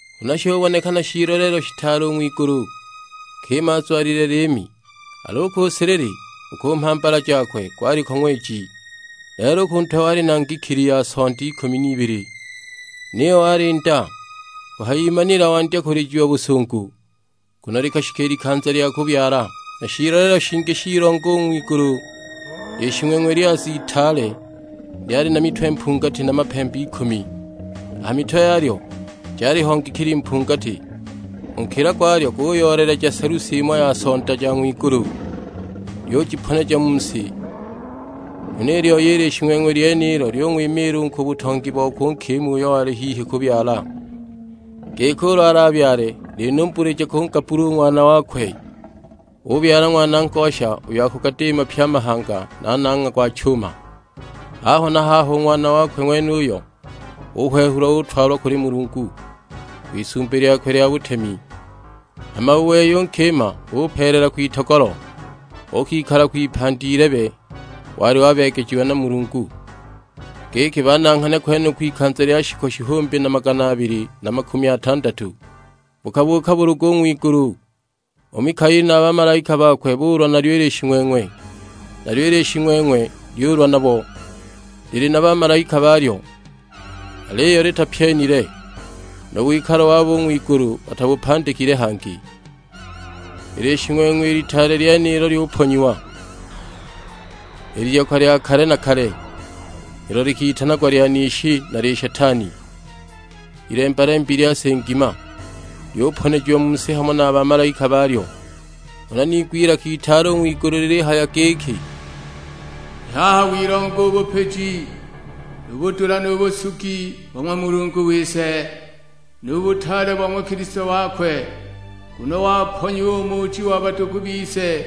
Huna shubonekana shiiloleelo shitaale u ng'wigulu: nkima azwalile liimi, al'u ku silili, u ku mhambala jakwe gwaliko ng'weji; lelo u ku ntwe wali na ngikili ya sonda ikumi n'ibili. Niyo wali nda; kuhayimanila wandya kulijiwa busungu, nguno likashika i likanza lya kubyala. Na shiiloleelo shingi shilonga u ng'wigulu, Lishing'weng'we lyaza itaale, lyali na mitwe mpungati na mapembe ikumi; a ha mitwe yalyo jaliho ngikili mpungati. U nkila gwalyo guyooleleja selusi imo ya Sonda ja ng'wigulu, lyujiponeja mu si. Huna i lyoi i Lishing'weng'we lyenilo lyung'wimiila u ku butongi bokwe u nkima uyo wali hihi kubyala, giki ulu alabyale linumbulije kungabbula u Ng'wana wakwe! Ubyala Ng'wana ngosha uyo akugadiima pye a mahanga na nangha gwa chuma; haho na haho u Ng'wana wakwe ng'wenuyo uhwehulwa utwalwa kuli Mulungu, kwIsumbi lyakwe lya butemi. Hama u wei u nkima upeelela kwitogolo, uukikala kwipandi ilebe wali wabeegejiwa na Mulungu, giki bananghane kwenuko ikanza lya shiku shihumbi na magana abili na makumi atandatu. Bukabuuka bulugu u ng'wigulu, u Mikaeli na a bamalaika bakwe buulwa nalyo i Lishing'weng'we; nalyo i Lishing'weng'we lyuulwa nabo, lili na bamalaika balyo. Aliyo litapyenile, nu wikalo wabo u ng'wigulu batabupandikile hangi. I Lishing'weng'we i litaale lyenilo lyuponyiwa, i Liyoka lya kale na kale, ilo likitanagwa Lyanishi na Lishetani, Ilemba-lembi lya si ngima; lyuponejiwa mu si hamo na a bamalaika balyo! Huna niigwa ilaka itaale u ng'wigulu lilihaya giki, "I haha wilonga u bupiji, nu budula nu busugi bo ng'wa Mulungu wise, nu butaale bo ng'wa Kilisto wakwe; nguno waponyiwa u muuji wa badugu bise,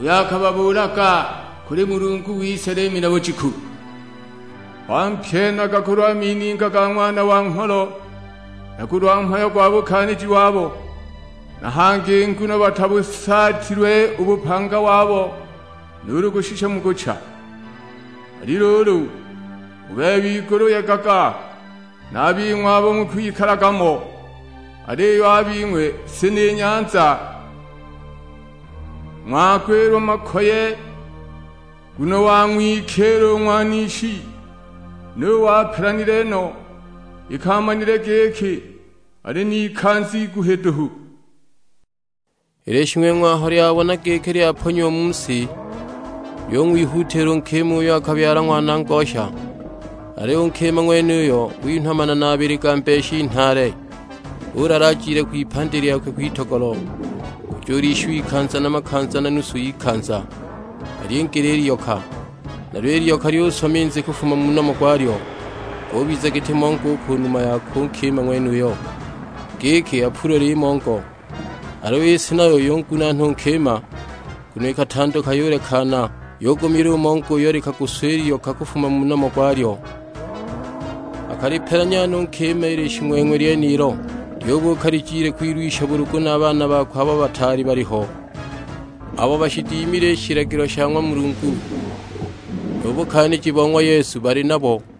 uyo akababuulaga kuli Mulungu wise liimi na bujiku. Bampyenaga kulwa mininga ga Ng'wana wa Ngholo, na kulwa mhayo gwa bukaaniji wabo; na hangi nguno batabusaatilwe u bupanga wabo nuulu kushisha mu kucha. Ali luulu, u bebe igulu yegaga; na a bing'we abo mukwikalaga mo. Aliyo a bing'we si na nyanza ng'wagwilwa makoye, nguno wang'wikiila u ng'wanishi; nuwe apelanile no, iki amanile giki ali n'ikanza iguhi duhu!" I Lishing'weng'we aho lyabona giki lyaponyiwa mu si lyung'wihuutiila u nkima uyo akabyala Ng'wana ngosha. Aliyo u nkima ng'wenuyo winhwa manana abili ga mbeshi nhaale, ulala ajile kwipandi lyakwe kwitogolo, kujulishiwa ikanza na makanza na nusu y'ikanza, alyingile i Liyoka. Nalyo i Liyoka lyuswa minzi kufuma mu nomo gwalyo; gubiza giti mongo u ku numa yakwe u nkima ng'wenuyo, giki apulwe limongo. Aliyo i si nayo yungunaana u nkima, nguno ikatanduka yulekana, yugumila u mongo uyo likaguswa i liyoka kufuma mu nomo gwalyo. Akalipelanya no u nkima i Lishing'weng'we lyenilo, lyubuuka lijile kwilwisha bulugu na a baana bakwe abo bataali baliho, abo bashidimile i shilagilo sha ng'wa Mulungu, nu bukaaniji bo ng'wa Yesu bali nabo.